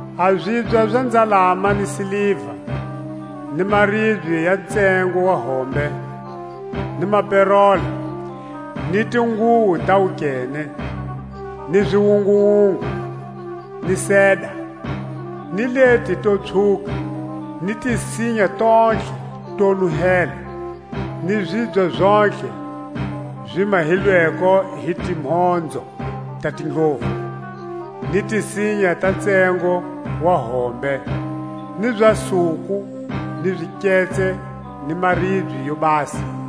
a zibya za nzalama ni siliva, ni maribye ya ntsengo wa hombe, ni maperola, ni tinguwo ta wukene, ni ziwunguwungu, ni seda, ni leti to pswhuka; ni tisinya tontlhe to nuhela, ni zibya zontlhe zi mahilweko hi timhonzo ta tindlovu ni tisinya ta ntsengo wa hombe, ni za suku ni ziketse ni maribye yo basa;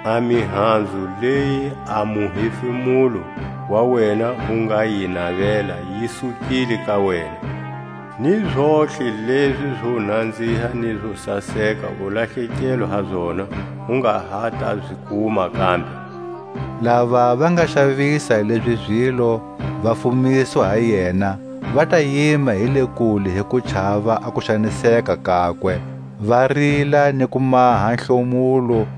A mihanzu leyi a muhefemulo wa wena wu nga yi navela yi sukile ka wena, ni zontlhe lezi zo nanziha hi zo saseka u lahlekelwe ha zona, u nga ha ta zi kuma kambe. Lava va nga xavisa lezi zilo, va fumiswa ha yena, va ta yima hi le kule hi ku chava a kuxaniseka kakwe, va rila ni ku maha hlomulo,